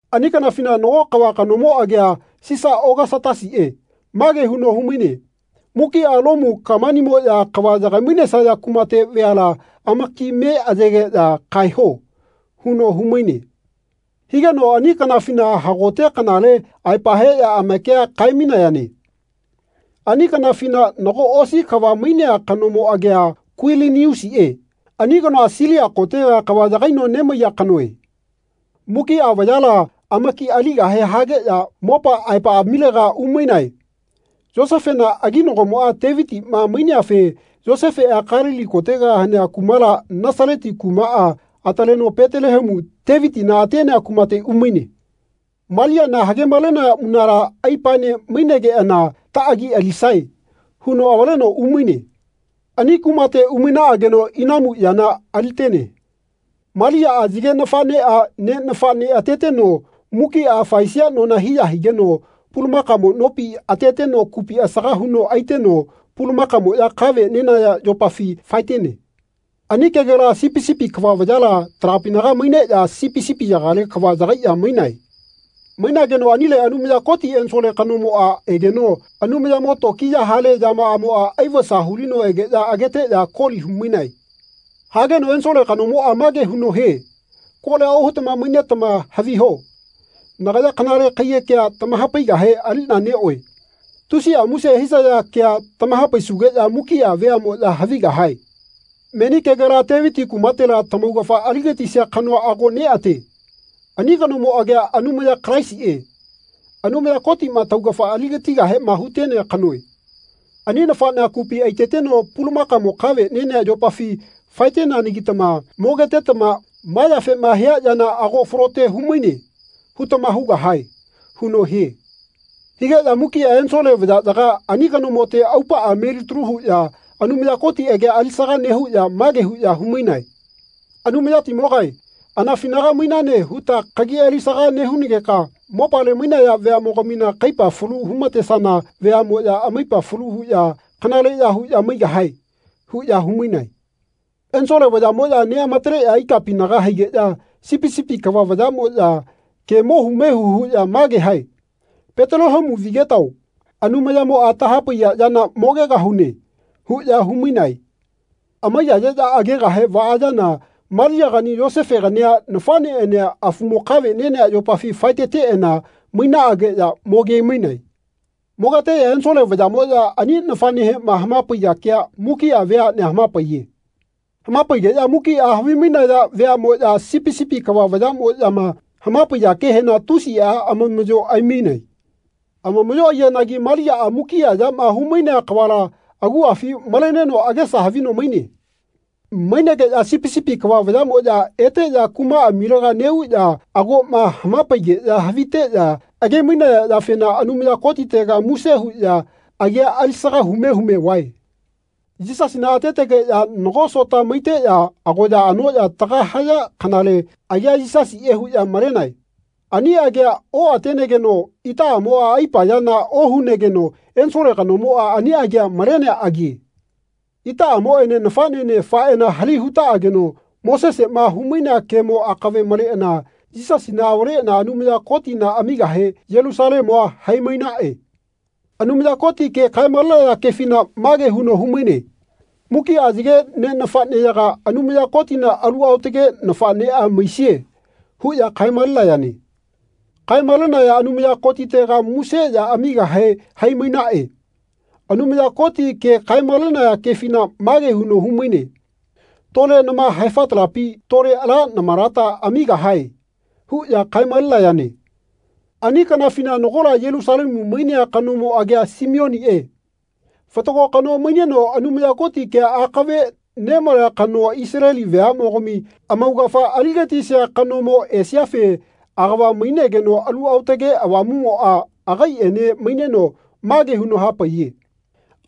Ani kanafina nago kava kanomo agia Sisa Ogasatasiꞌe mage huno humaine “Mukiꞌa Lomu kamanimoꞌya kava yagaimainesaya kumate veala amaki me ayegeꞌya kaeho.” huno humaine. Higeno ani kanafina hagote kanale aepa heꞌya amakia kaemainayane. Ani kanafina nago osi kava mainea kanomo agia Kuiliniusiꞌe ani kanoa Silia kotega kava yagaino nemaiya kanoe. Mukiꞌa vayala amaki aligahe hageꞌya mopa aepaꞌamilega umainae. Yosefena aginagomoꞌa Tevitiꞌma maineafe Yosefeꞌa Kalili kotega hanea kumala Nasaleti kumaꞌa ataleno Petelehemu, Tevitina atenea kumate umaine. Maliana hagemalenaya munala aipaene mainegeꞌana “Taꞌagi alisae.” huno avaleno umaine. Ani kumate umainaꞌageno inamu yana alitene. Maliaꞌa yage nafaꞌneꞌa ne nafaꞌne ateteno mukiꞌa faesia nona hiya higeno pulamakamo nopi ateteno kupi asaga huno aiteno pulamakamoꞌya kave nenaya yopafi faetene. Ani kegela sipi sipi kava vayala talapinaga maineꞌya sipi sipiyagale kava yagaiꞌya mainae. Mainageno anile Anumaya Koti ensole kanomoꞌa egeno Anumayamo tokiya hale yamaꞌamoꞌa aivasa hulino egeꞌya ageteꞌya koli humainae. Hageno ensole kanomoꞌa mage huno hie “Kolia ohutama mainetama haviho nagaya kanale kaiyekea tamahapaigahe aliꞌna neꞌoe. Tusiꞌa muse hisaya kea tamahapaisugeꞌya mukiꞌa veaꞌmoꞌya havigahae. Meni kegela Teviti kumatela tamaugafa aligatisia kanoa ago neꞌate. Ani kanomo agia Anumaya Kalaisiꞌe, Anumaya Kotiꞌma taugafa aligatigahema hutenea kanoe. Ani nafaꞌnea kupi aiteteno pulamakamo kave nenea yopafi faeteneanagitama mogetetama ‘Ma yafema hia yana ago falote humaine.’ hutama hugahae.” huno hie. Higeꞌya mukiꞌa ensole vayaꞌyaga ani kanomote aupaꞌa melitalu huꞌya Anumaya Koti agia alisaga nehuꞌya mage huꞌya humainae. “Anumayatimogae anafinaga mainane huta kagi alisaga nehunageka mopale mainaya veaꞌmogamina kaipa falu humatesana veaꞌmoꞌya amaipa falu huꞌya kanaleꞌya huꞌya maigahae.” huꞌya humainae. Ensole vayaꞌmoꞌya neꞌamataleꞌya ikapinaga haigeꞌya sipi sipi kava vayaꞌmoꞌya ke mohu mehu huꞌya mage hae “Petelehemu vigetao Anumayamoꞌa tahapaiya yana mogegahune.” huꞌya humainae. Amaiyayeꞌya agegahe vaayana Maliagani Yosefegania nafaꞌneꞌania afumo kave nenea yopafi faeteteꞌana mainaꞌageꞌya mogemainae. Mogeteꞌya ensole vayaꞌmoꞌya ani nafaꞌnehema hamapaiya kea mukiꞌa veaꞌnea hamapaiye. Hamapaigeꞌya mukiꞌa havimainaya veaꞌꞌmoꞌya sipi sipi kava vayaꞌmoꞌyama hamapaiya kehena tusiꞌa amamaꞌyo aimainae. Amamaꞌyo aiyanagi Maliaꞌa mukiꞌa yama humainea kavala aguꞌafi maleneno agesa havino maine. Mainegeꞌya sipi sipi kava vayaꞌmoꞌya eteꞌya kumaꞌamilega neꞌuꞌya agoꞌma hamapaigeꞌya haviteꞌya agemainaya yafena Anumaya Kotitega muse huꞌya agia alisaga hume hume vae. Yisasina atetegeꞌya nago sota maiteꞌya agoya anoꞌya tagama haya kanale agia Yisasiꞌe huꞌya malenae. Ani agia oꞌatenegeno itaꞌamoꞌa aipa yana ohunegeno ensole kanomoꞌa ani agia malenea agie. Itaꞌamoꞌene nafaꞌnene faeꞌana hali hutaꞌageno Moseseꞌma humainea kemo akave maleꞌana Yisasina avaleꞌana Anumaya Kotina amigahe Yelusalemua haimainaꞌe. Anumaya Koti ke kaemalenaya kefina mage huno humaine “Mukiꞌa yage ne nafaꞌneyaga Anumaya Kotina alu aotage nafaꞌneꞌa maisie.” huꞌya kaemalenayane. Kaemalenayana Anumaya Kotitega muse ya amigahe haimainaꞌe. Anumaya Koti ke kaemalenaya kefina mage huno humaine “Tole nama haefatalapi tole ala namalata amigahae.” huꞌya kaemalenayane. Ani kanafina nagola Yelusalemu mainea kanomo agia Simioniꞌe. Fatago kano maineno Anumaya Koti kea akave nemalea kanoa Isaleli veaꞌmogami amaugafa aligatisia kanomo esiafe agava mainegeno Alu Aotage Avamuꞌmoꞌa agaiꞌene maineno mage huno hapaiye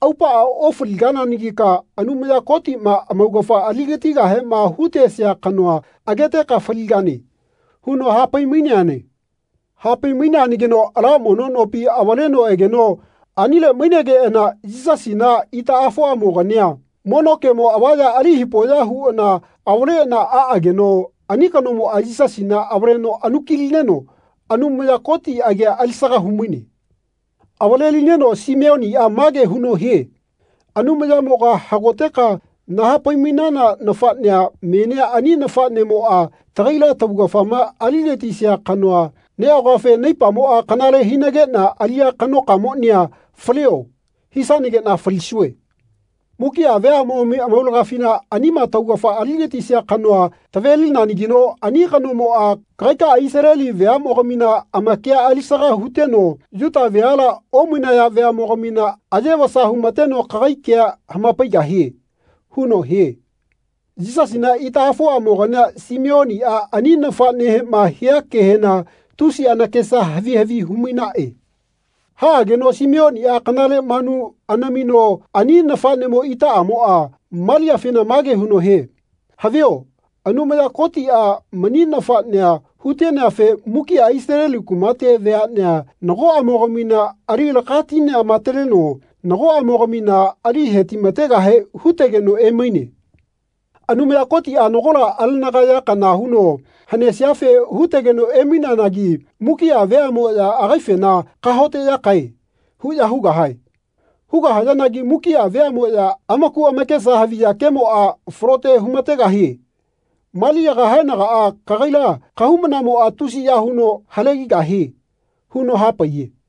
“Aupaꞌa ofaligananagika Anumaya Kotiꞌma amaugafa aligatigahema hutesia kanoa ageteka faligane.” huno hapaimaineane. Hapaimaineanagino ala mono nopi avaleno egeno anile mainegeꞌana Yisasina itaꞌafoꞌamogania mono kemo avaya ali hipoꞌya huꞌana avaleꞌana aꞌageno ani kanomoꞌa Yisasina avaleno anukilineno Anumaya Koti agia alisaga humaine. Avalelineno Simeoniꞌa mage huno hie “Anumayamoga hagoteka nahapaimainana nafaꞌnea menia ani nafaꞌnemoꞌa tagaila taugafama aligatisia kanoa neꞌagoafe naipamoꞌa kanale hinageꞌna aliꞌya kanokamonia ‘Falio.’ hisanageꞌna falisue. Mukiꞌa veaꞌmogami amaulagafina anima taugafa aligatisia kanoa tavelinanagino ani kanomoꞌa kagaikaꞌa Isaleli veaꞌmogamina amakia alisaga huteno Yuta veala omainaya veaꞌmogamina aye vasa humateno kagai kea hamapaigahie.” huno hie. Yisasina itaꞌafoꞌamogania Simeoniꞌa ani nafaꞌnehema hia kehena tusi anakesa havi havi humainaꞌe. Haꞌageno Simeoniꞌa kanale manu anamino ani nafaꞌnemo itaꞌamoꞌa, Maliafena mage huno hie “Havio Anumaya Kotiꞌa mani nafaꞌnea huteneafe mukiꞌa Isaleli kumate veaꞌnea nagoꞌamogamina ali lakatineꞌamataleno nagoꞌamogamina ali hetimategahe hutegeno emaine. Anumaya Kotiꞌa nagola alegana ya kana huno hanesiafe hutegeno emaineanagi mukiꞌa veaꞌmoꞌya agaifena ‘Kahaoteꞌyakae.’ huꞌya hugahae. Hugahayanagi mukiꞌa veaꞌmoꞌya amaku amakesa haviya kemoꞌa falote humategahie. Maliaga haenagaꞌa kagaila kahaumanamoꞌa tusiya huno halegahie.” huno hapaiye.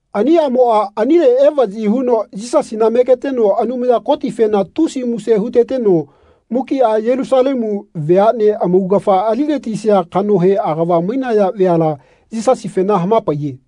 Ani aꞌmoꞌa anile evaꞌyi huno Yisasina megeteno Anumaya Kotifena tusi muse huteteno mukiꞌa Yelusalemu veaꞌnea amaugafa aligatisia kanohe agava mainaya veala Yisasifena hamapaiye.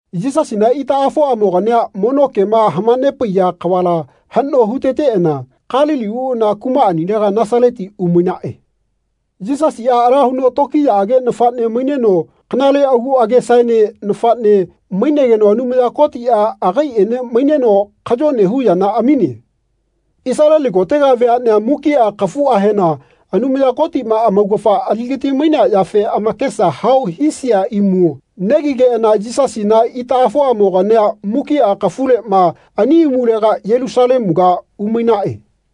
Yisasina itaꞌafoꞌamogania mono kema hamanepaiya kavala haꞌno huteteꞌana Kalili uꞌana kumaꞌanilega Nasaleti umainaꞌe. Yisasiꞌa ala huno tokiyaꞌage nafaꞌne maineno kanale agu agesaene nafaꞌne mainegeno Anumaya Kotiꞌa agaiꞌene maineno kayone hu yana amine. Isaleli kotega veaꞌnea mukiꞌa kafuꞌahena Anumaya Kotiꞌma amaugafa aligatimainea yafe amakesa hao hisia imu negigeꞌana Yisasina itaꞌafoꞌamogania mukiꞌa kafuleꞌma ani imulega Yelusalemuga umainaꞌe.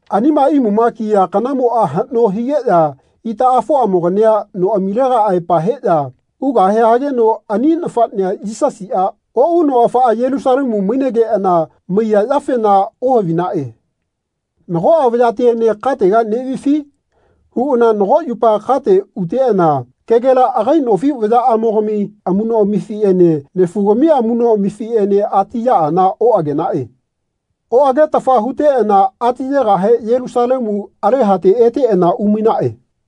Anima imuma kiya kanamoꞌa haꞌno higeꞌya itaꞌafoꞌamogania noꞌamilega aepa heꞌya ugahe hageno ani nafaꞌnea Yisasiꞌa oꞌuno afaꞌa Yelusalemu mainegeꞌana maiya yafena ohavinaꞌe. “Nagoꞌa vayatiene katega neꞌvifi?” huꞌana nago yupa kate uteꞌana kegela agai nofi vayaꞌamogami amuꞌnoꞌamifiꞌene nefugami amuꞌnoꞌamifiꞌene atiyaꞌana oꞌagenaꞌe. Oꞌagetafa huteꞌana atiyegahe Yelusalemu alehate eteꞌana umainaꞌe.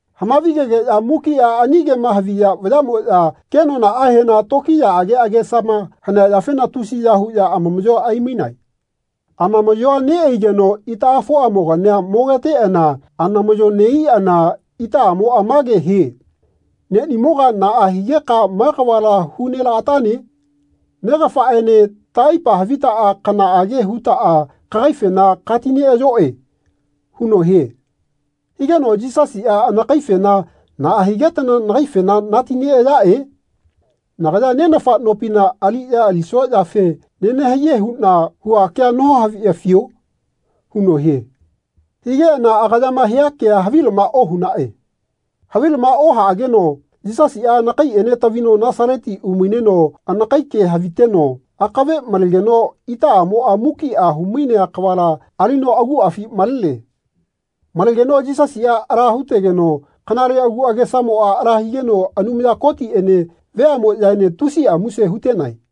Hamavigegeꞌya mukiꞌa ani kema haviya vayaꞌmoꞌya kenonaꞌahena tokiyaꞌage agesama hanea yafena tusiya huꞌya amamaꞌyoa aimainae. Amamaꞌyoa neꞌaigeno itaꞌafoꞌamogania mogeteꞌana anamaꞌyo neꞌaiꞌana itaꞌamoꞌa mage hie “Neꞌnimoga naꞌa higeka ma kavala hu nelaꞌatane? Negafaꞌene taꞌaipa havitaꞌa kanaꞌage hutaꞌa kagaifena katineꞌayoꞌe.” huno hie. Higeno Yisasiꞌa anakaifena “Naꞌa higetana nagaifena natineꞌayaꞌe? Nagaya Nenafa nopina aliꞌya alisua yafe nenahaiye huꞌna hua kea nohaviꞌafio?” huno hie. Higeꞌana agayama hia kea havilama ohunaꞌe. Havilama ohaꞌageno Yisasiꞌa anakaiꞌene tavino Nasaleti umaineno anakai ke haviteno akave malegeno itaꞌamoꞌa mukiꞌa humainea kavala alino aguꞌafi malene. Malegeno Yisasiꞌa ala hutegeno kanale aku agesamoꞌa ala higeno Anumaya Kotiꞌene veaꞌmoꞌyaene tusiꞌa muse hutenae.